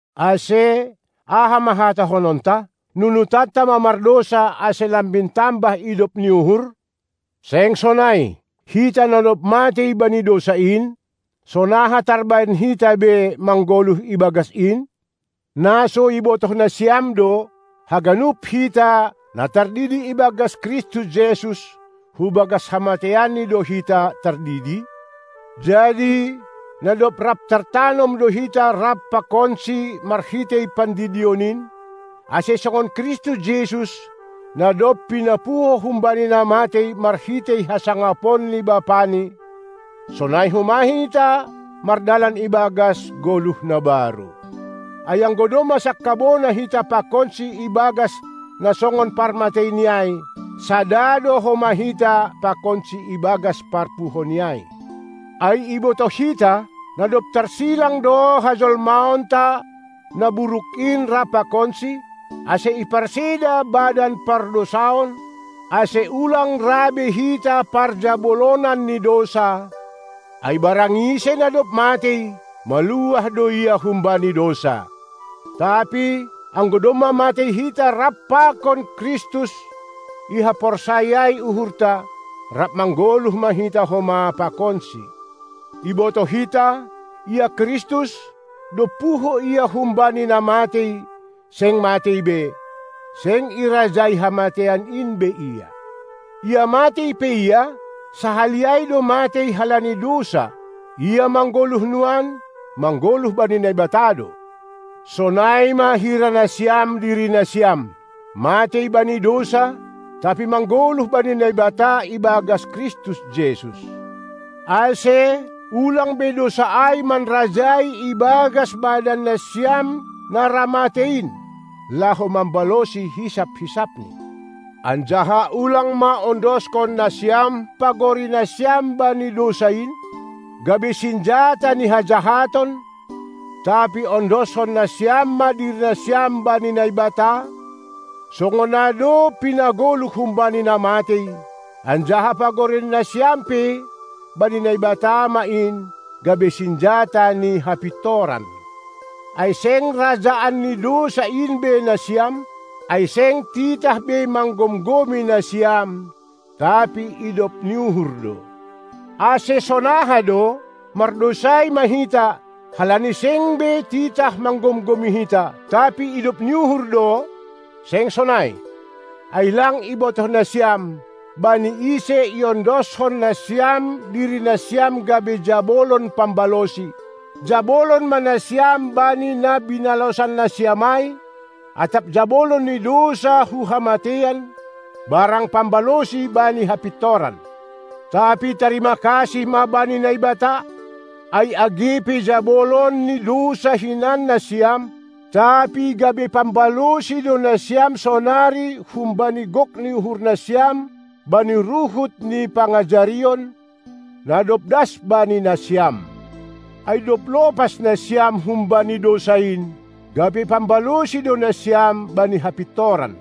Ase, aha ma hatahononta? Nunutonta ma mardousa, ase lambin tambah idop ni uhur? Seng sonai! Hita, na dob matei bani dousa in, sonaha tarbahen hita be manggoluh ibagas in? Na so ibotoh nasiam do, haganup hita, na tardidi ibagas Kristus Jesus, hubagas hamateianNi do hita tardidi? Jadi na dob rap tartanom do hita rap pakonSi marhitei pandidion in, ase songon Kristus Jesus, na dob pinapuho humbani na matei marhitei hasangapon ni BapaNi, sonai homa hita mardalan ibagas goluh na baru. Ai anggo domma sangkabona hita pakonSi ibagas na songon parmateiNi ai, sada do homa hita pakonSi ibagas parpuhoNi ai. Ai ibotoh hita, na dob tarsilang do hajolmaonta na buruk in rap pakonSi, ase iparseda badan pardousaon, ase ulang ra be hita parjabolonan ni dousa, ai barang ise na dob matei, maluah do ia humbani dousa. Tapi, anggo domma matei hita rap pakon Kristus ihaporsayai uhurta, rap manggoluh ma hita homa pakonSi. Ibotoh hita, ia Kristus, dob puho Ia humbani na matei, seng matei be; seng irajai hamateian in be Ia. Ia matei pe Ia, sahali ai do matei halani dousa; ia manggoluh nuan, manggoluh bani Naibata do. Sonai ma hira nasiam dirinasiam: Matei bani dousa, tapi manggoluh bani Naibata ibagas Kristus Jesus. Ase, ulang be dousa ai manrajai ibagas badannasiam na ra matei in, laho mambalosi hisap-hisapni. Anjaha ulang ma ondoskon nasiam pagorinasiam bani dousa in, gabe sinjata ni hajahaton, tapi ondoskon nasiam ma dirinasiam bani Naibata, songon na dob pinagoluh humbani na matei, anjaha pagorinasiam pe, bani Naibata ma in, gabe sinjata ni hapintoran. Ai seng rajaan ni dousa in be nasiam, ai seng titah be manggomgomi nasiam, tapi idop ni uhur do. Ase, sonaha do? Mardousai ma hita, halani seng be titah manggomgomi hita, tapi idop ni uhur do? Seng sonai! Ai lang ibotoh nasiam, bani ise iondoskon nasiam dirinasiam gabe jabolon pambalosi, jabolon ma nasiam bani na binalosannasiam ai, atap jabolon ni dousa hu hamateian, barang pambalosi bani hapintoran. Tapi tarima kasih ma bani Naibata, ai age pe jabolon ni dousa hinan nasiam, tapi gabe pambalosi do nasiam sonari humbani gok ni uhurnasiam bani ruhut ni pangajarion, na dob das bani nasiam. Ai dob lopas nasiam humbani dousa in, gabe pambalosi do nasiam bani hapintoran.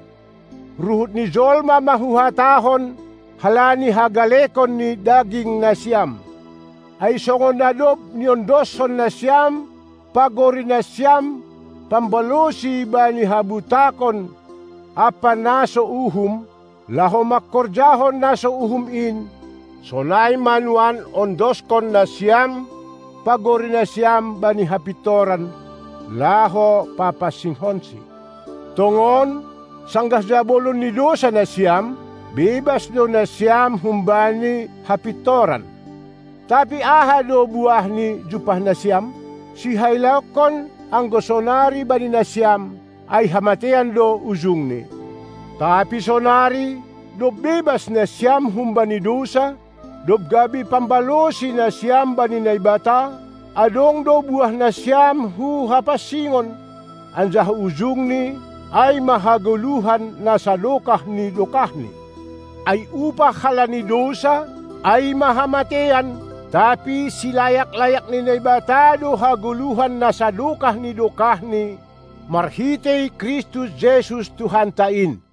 Ruhut ni jolma ma huhatahon halani hagalekon ni dagingnasiam. Ai songon na dob niondoskon nasiam pagorinasiam pambalosi bani habutakon ampa na so uhum, laho mangkorjahon na so uhum in, sonai ma nuan ondoskon nasiam pagorinasiam bani hapintoran, laho papansingkonsi. Tongon sanggah jabolon ni dousa nasiam, bebas do nasiam humbani hapintoran. Tapi aha do buahni jumpah nasiam? Sihailaonkon anggo sonari bani nasiam, ai hamateian do ujungni. Tapi sonari, dob bebas nasiam humbani dousa, dob gabe pambalosi nasiam bani Naibata, adong do buahnasiam hu hapansingon; anjaha ujungni ai ma hagoluhan na sadokah ni dokahni. Ai upah halani dousa, ai ma hamateian, tapi silayak-layak ni Naibata do hagoluhan na sadokah ni dokahni marhitei Kristus Jesus Tuhanta in.